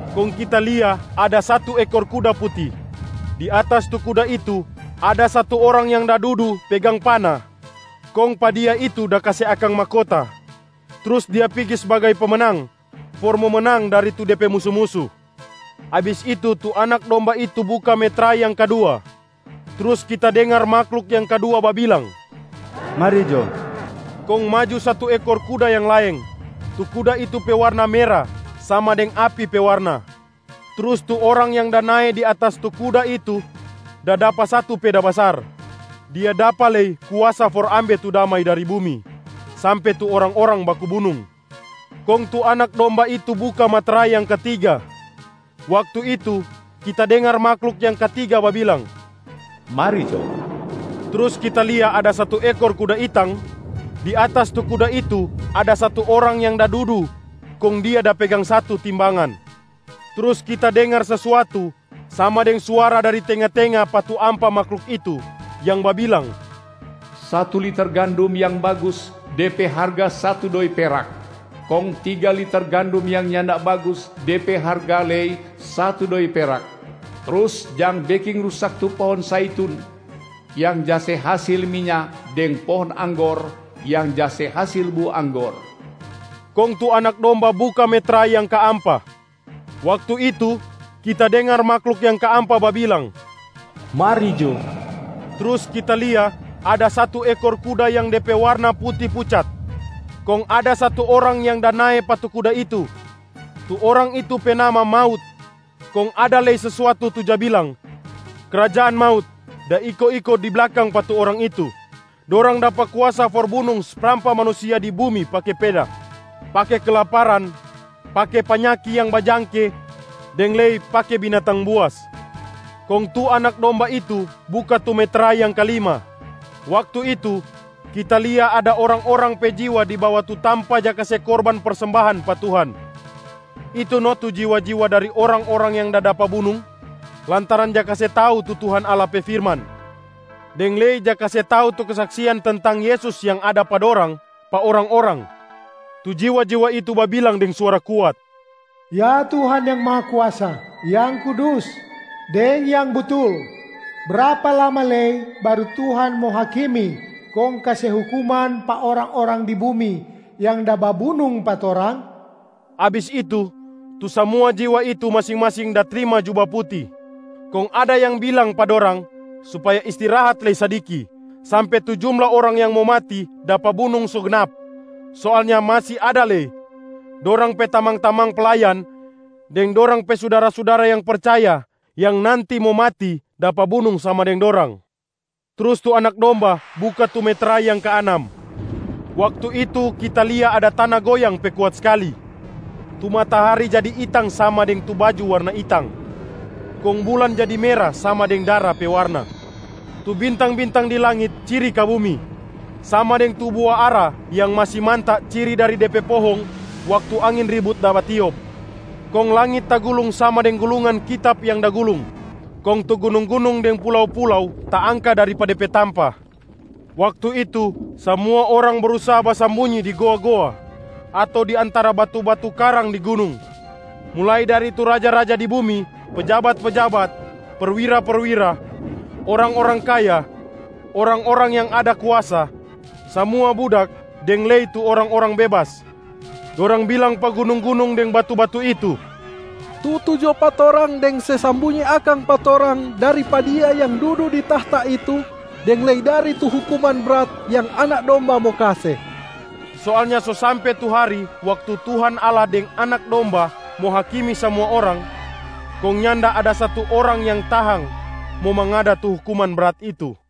Kong kita lia ada satu ekor kuda puti. Di atas tu kuda itu ada satu orang yang da dudu pegang pana, kong pa dia itu da kase akang mahkota, trus dia pigi sbagai pemenang for mo menang dari tu de pe musu-musu. Abis itu, tu Anak Domba itu buka metrai yang kadua, trus kita dengar mahluk yang kadua babilang, “Mari jo!” Kong maju satu ekor kuda yang laeng. Tu kuda itu pe warna mera sama deng api pe warna. Trus tu orang yang da nae di atas tu kuda itu da dapa satu peda basar. Dia dapa lei kuasa for ambe tu damai dari bumi, sampe tu orang-orang baku bunung. Kong tu Anak Domba itu buka metrai yang katiga. Waktu itu, kita dengar mahluk yang katiga babilang, “Mari jo!” Trus kita lia ada satu ekor kuda itang. Di atas tu kuda itu ada satu orang yang da dudu kong dia da pegang satu timbangan. Trus kita dengar sesuatu sama deng suara dari tenga-tenga pa tu ampa mahluk itu yang babilang, “Satu liter gandum yang bagus, de pe harga satu doi perak, kong tiga liter gandum yang nyanda bagus, de pe harga lei satu doi perak, trus jang beking rusak tu pohong zaitun yang ja se hasil minya deng pohong anggor yang ja se hasil bua anggor.” Kong tu Anak Domba buka metrai yang kaampa. Waktu itu, kita dengar mahluk yang kaampa babilang, “Mari jo!” Trus kita lia ada satu ekor kuda yang de pe warna puti pucat, kong ada satu orang yang da nae pa tu kuda itu. Tu orang itu pe nama ‘Maut’. Kong ada lei sesuatu tu ja bilang ‘krajaan maut’ da iko-iko di blakang pa tu orang itu. Dorang dapa kuasa for bunung sprampa manusia di bumi pake peda, pake kelaparan, pake panyaki yang bajangke deng lei pake binatang buas. Kong tu Anak Domba itu buka tu metrai yang kalima. Waktu itu, kita lia ada orang-orang pe jiwa di bawa tu tampa ja kase korban persembahan pa Tuhan. Itu no tu jiwa-jiwa dari orang-orang yang da dapa bunung lantaran ja kase tau tu Tuhan Allah pe firman, deng lei ja kase tau tu kesaksian tentang Yesus yang ada pa dorang pa orang-orang. Tu jiwa-jiwa itu babilang deng suara kuat, “Ya Tuhan yang Mahakuasa, yang kudus, deng yang butul! Brapa lama lei baru Tuhan mo hakimi kong kase hukuman pa orang-orang di bumi yang da babunung pa torang?” Abis itu, tu samua jiwa itu masing-masing da trima juba puti, kong ada yang bilang pa dorang supaya istirahat lei sadiki sampe tu jumla orang yang mo mati dapa bunung so gnap. Soalnya masi ada lei dorang pe tamang-tamang playan deng dorang pe sudara-sudara yang percaya yang nanti mo mati dapa bunung sama deng dorang. Trus tu Anak Domba buka tu metrai yang kaanam. Waktu itu kita lia ada tana goyang pe kuat skali, tu matahari jadi itang sama deng tu baju warna itang, kong bulan jadi mera sama deng dara pe warna. Tu bintang-bintang di langit ciri ka bumi, sama deng tu bua ara yang masi manta ciri dari de pe pohong waktu angin ribut da batiop. Kong langit tagulung sama deng gulungan kitab yang da gulung, kong tu gunung-gunung deng pulau-pulau taangka dari pa de pe tampa. Waktu itu, samua orang brusaha basambunyi di goa-goa ato di antara batu-batu karang di gunung, mulai dari tu raja-raja di bumi, pejabat-pejabat, perwira-perwira, orang-orang kaya, orang-orang yang ada kuasa, samua budak deng lei tu orang-orang bebas. Dorang bilang pa gunung-gunung deng batu-batu itu, “Tutu jo pa torang deng se sambunyi akang pa torang dari pa Dia yang dudu di tahta itu deng lei dari tu hukuman brat yang Anak Domba mo kase.” Soalnya so sampe tu hari waktu Tuhan Allah deng Anak Domba mo hakimi samua orang, kong nyanda ada satu orang yang tahang mo mangada tu hukuman brat itu.